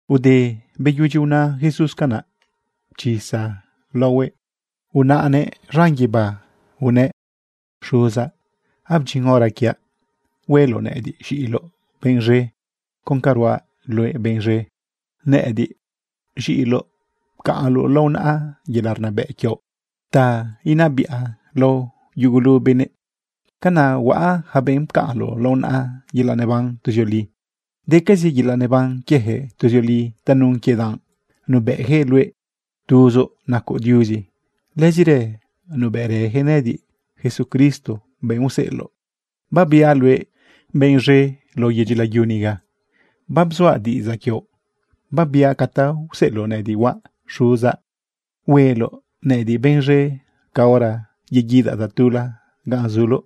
Ude beyudyi una Jesús canaꞌ, pchisa laohuëꞌ unaꞌnëꞌ z̃an guibá unëꞌ: ―Xuzaꞌ, abdyin hora quiaꞌ. Hueloꞌ nëꞌëdiꞌ z̃iꞌiloꞌ benꞌ z̃e con ca ruaꞌ luëꞌ benꞌ z̃e. Nëꞌëdiꞌ, z̃iꞌiloꞌ, bapcaꞌnloꞌ lao naꞌa yelaꞌ rnabëꞌ quioꞌ ta inabiꞌa lao yugulu benëꞌ. Canaꞌ huaꞌa yaca benꞌ pcaꞌnloꞌ lao naꞌa yelaꞌ neban tuzioli. Decazi yelaꞌ neban quieyaquëꞌ tuzioli tanun quie danꞌ nubëꞌyaquëꞌ luëꞌ tuzoꞌ nacoꞌ Diuzi. Lëzirë nubëꞌrëyaquëꞌ nëꞌëdiꞌ, Jesucristo, benꞌ useꞌeloꞌ. ’Babiaꞌ luëꞌ benꞌ z̃e lao yedyi layu niga. Babzuaꞌ diꞌidzaꞌ quioꞌ, babiaꞌ ca ta useꞌeloꞌ nëꞌëdiꞌ huaꞌ. Xuzaꞌ, hueloꞌ nëꞌëdiꞌ benꞌ z̃e caora yeguidaꞌ tatula ganꞌ zuloꞌ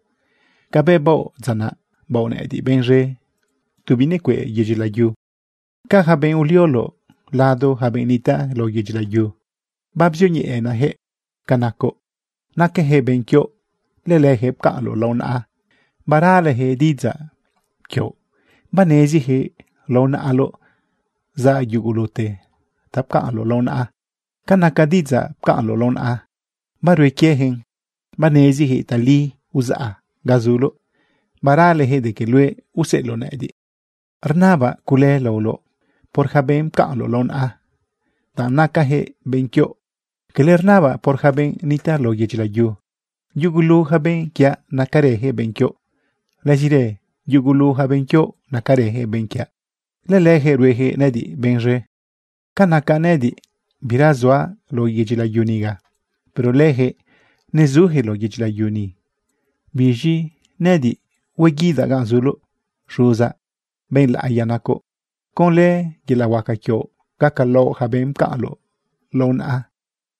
cabëꞌ baoꞌ dza naꞌ, baoꞌ nëꞌëdiꞌ benꞌ z̃e tu binecueꞌ yedyi layu. ’Ca yaca benꞌ ulioloꞌ lado yaca benꞌ nitaꞌ lao yedyi layu, babzioñeꞌenaꞌyaquëꞌ ca nacoꞌ. Nacayaquëꞌ benꞌ quioꞌ. Lëleyaquëꞌ pcaꞌnloꞌ lao naꞌa, baraleyaquëꞌ diꞌidzaꞌ quioꞌ. Baneziyaquëꞌ lao naꞌaloꞌ zaꞌ yugulute ta pcaꞌnloꞌ lao naꞌa. Ca naca diꞌidzaꞌ pcaꞌnloꞌ lao naꞌa, barue quieyaquëꞌn. Baneziyaquëꞌ tali uzaꞌ ga zuloꞌ, baraleyaquëꞌ de que luëꞌ useꞌeloꞌ nëꞌëdiꞌ. ’Rnabaꞌ cule laoloꞌ por yaca benꞌ pcaꞌnloꞌ lao naꞌa, danꞌ nacayaquëꞌ benꞌ quioꞌ. Cala rnabaꞌ por yaca benꞌ nitaꞌ lao yedyi layu. Yugulu yaca benꞌ quiaꞌ, nacarëyaquëꞌ benꞌ quioꞌ. Lëzirë yugulu yaca benꞌ quioꞌ, nacarëyaquëꞌ benꞌ quiaꞌ. Lëleyaquëꞌ rueyaquëꞌ nëꞌëdiꞌ benꞌ z̃e. ’Ca naca nëꞌëdiꞌ, bira suaꞌ lao yedyi layu niga. Pero leyaquëꞌ nezuyaquëꞌ lao yedyi layu ni. Biz̃i nëꞌëdiꞌ hueguidaꞌ ganꞌ zuloꞌ. Xuzaꞌ, benꞌ laꞌiya nacoꞌ, conlë yelaꞌ huaca quioꞌ gacalaoꞌ yaca benꞌ pcaꞌnloꞌ lao naꞌa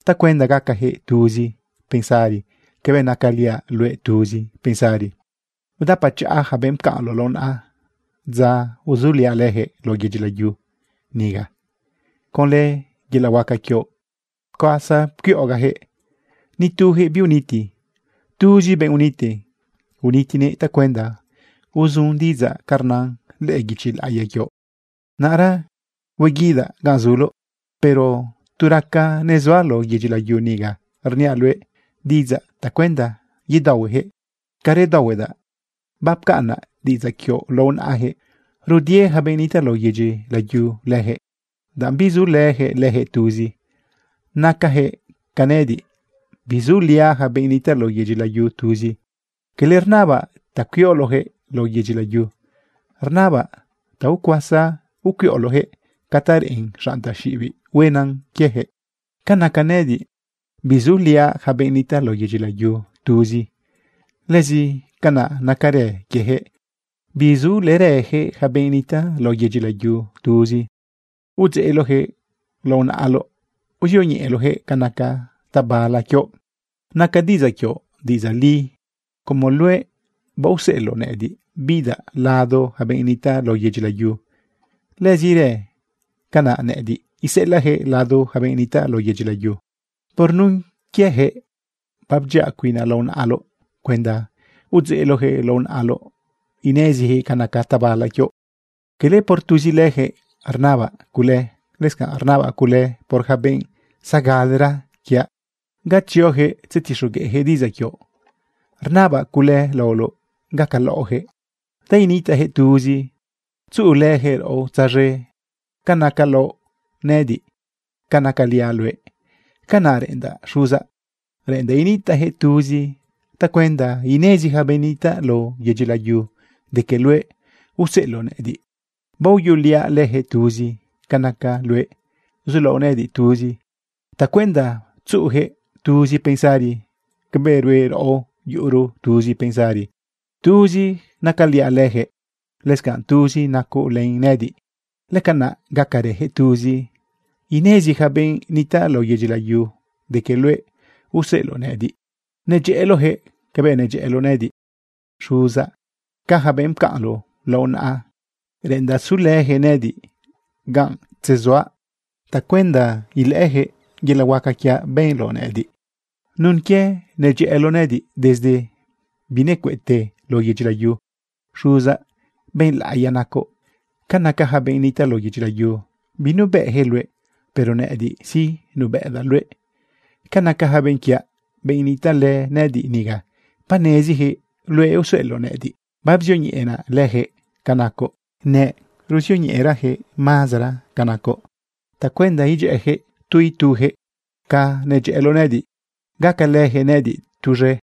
tacuenda gacayaquëꞌ tuzi pensari cabëꞌ nacaliaꞌ luëꞌ tuzi pensari. Udapachaꞌa yaca benꞌ pcaꞌnloꞌ lao naꞌa dza uzuliaꞌ leyaquëꞌ lao yedyi layu niga. Conlë yelaꞌ huaca quioꞌ pcuasa pcuiꞌogaꞌyaquëꞌ, nituyaquëꞌ biuniti. Tuzi benꞌ uniti unitinëꞌ tacuenda uzun diꞌidzaꞌ ca rnan lëꞌë guichi laꞌiya quioꞌ. ’Naꞌra hueguidaꞌ ganꞌ zuloꞌ. Pero tu raca nezuaꞌ lao yedyi layu niga, rniaꞌ luëꞌ diꞌidzaꞌ tacuenda yedaohueyaquëꞌ ca redaohuedaꞌ. Bapcaꞌnaꞌ diꞌidzaꞌ quioꞌ lao naꞌayaquëꞌ. Rudie yaca benꞌ nitaꞌ lao yedyi layu leyaquëꞌ, danꞌ bizulëyaquëꞌ leyaquëꞌ tuzi. Nacayaquëꞌ ca nëꞌëdiꞌ, bizuliaꞌ yaca benꞌ nitaꞌ lao yedyi layu tuzi. Cala rnabaꞌ ta cuioloꞌyaquëꞌ lao yedyi layu, rnabaꞌ ta ucuasa ucuiꞌoloꞌyaquëꞌ ca ta reꞌen xanꞌ taxiꞌibiꞌ huenan quieyaquëꞌ. Ca naca nëꞌëdiꞌ, bizuliaꞌ yaca benꞌ nitaꞌ lao yedyi layu tuzi, lëzi canaꞌ nacarë quieyaquëꞌ, bizulërëyaquëꞌ yaca benꞌ nitaꞌ lao yedyi layu tuzi. Udzeꞌloꞌyaquëꞌ lao naꞌaloꞌ. Uzioñeꞌeloꞌyaquëꞌ ca naca tabala quioꞌ. Naca diꞌidzaꞌ quioꞌ diꞌidzaꞌ li. Como luëꞌ baoseꞌeloꞌ nëꞌëdiꞌ bidaꞌ lado yaca benꞌ nitaꞌ lao yedyi layu, lëzirë canaꞌ nëꞌëdiꞌ iseꞌelaꞌyaquëꞌ lado yaca benꞌ nitaꞌ lao yedyi layu. Por nun quieyaquëꞌ babdyiaꞌ cuinaꞌ lao naꞌaloꞌ cuenda udzeꞌloꞌyaquëꞌ lao naꞌaloꞌ ineziyaquëꞌ ca naca tabala quioꞌ. ’Cala por tuzi leyaquëꞌ rnabaꞌ cule, lëscanꞌ rnabaꞌ cule por yaca benꞌ zagalera quiaꞌ ga tzioyaquëꞌ tzetixogueꞌyaquëꞌ diꞌidzaꞌ quioꞌ. Rnabaꞌ cule laoloꞌ gacalaoꞌyaquëꞌ ta initaꞌyaquëꞌ tuzi tzuꞌulëyaquëꞌ raꞌo tzaz̃e ca nacalaoꞌ nëꞌëdiꞌ, ca nacaliaꞌ luëꞌ. Canaꞌ reꞌendaꞌ Xuzaꞌ, reꞌendaꞌ initaꞌyaquëꞌ tuzi tacuenda inezi yaca benꞌ nitaꞌ lao yedyi layu de que luëꞌ useꞌeloꞌ nëꞌëdiꞌ. Baoyuꞌuliaꞌ leyaquëꞌ tuzi ca naca luëꞌ zulaoꞌ nëꞌëdiꞌ tuzi tacuenda tzuꞌuyaquëꞌ tuzi pensari cabëꞌ rue raꞌo, yuꞌuro tuzi pensari. Tuzi nacaliaꞌ leyaquëꞌ, lëscanꞌ tuzi nacoꞌ len nëꞌëdiꞌ. Lëcanaꞌ gacarëyaquëꞌ tuzi, inezi yaca benꞌ nitaꞌ lao yedyi layu de que luëꞌ useꞌeloꞌ nëꞌëdiꞌ, nedyëꞌëloꞌyaquëꞌ cabëꞌ nedyëꞌëloꞌ nëꞌëdiꞌ. ’Xuzaꞌ, ca yaca benꞌ pcaꞌnloꞌ lao naꞌa, reꞌendaꞌ sulëyaquëꞌ nëꞌëdiꞌ ganꞌ tzesuaꞌ tacuenda ilëꞌëyaquëꞌ yelaꞌ huaca quiaꞌ benloꞌ nëꞌëdiꞌ nun quie nedyëꞌëloꞌ nëꞌëdiꞌ desde binecueꞌte lao yedyi layu. Xuzaꞌ, benꞌ laꞌiya nacoꞌ. Ca naca yaca benꞌ nitaꞌ lao yedyi layu, binubëꞌyaquëꞌ luëꞌ, pero nëꞌëdiꞌ sí, nubëꞌdaꞌ luëꞌ. Ca naca yaca benꞌ quiaꞌ, benꞌ nitaꞌlë nëꞌëdiꞌ niga, baneziyaquëꞌ luëꞌ useꞌeloꞌ nëꞌëdiꞌ. Babzioñeꞌenaꞌ leyaquëꞌ ca nacoꞌ. Neruzioñeꞌeraꞌyaquëꞌ mazara ca nacoꞌ tacuenda idyëꞌëyaquëꞌ tu ituyaquëꞌ ca nedyëꞌëloꞌ nëꞌëdiꞌ, gacalëyaquëꞌ nëꞌëdiꞌ tuz̃e.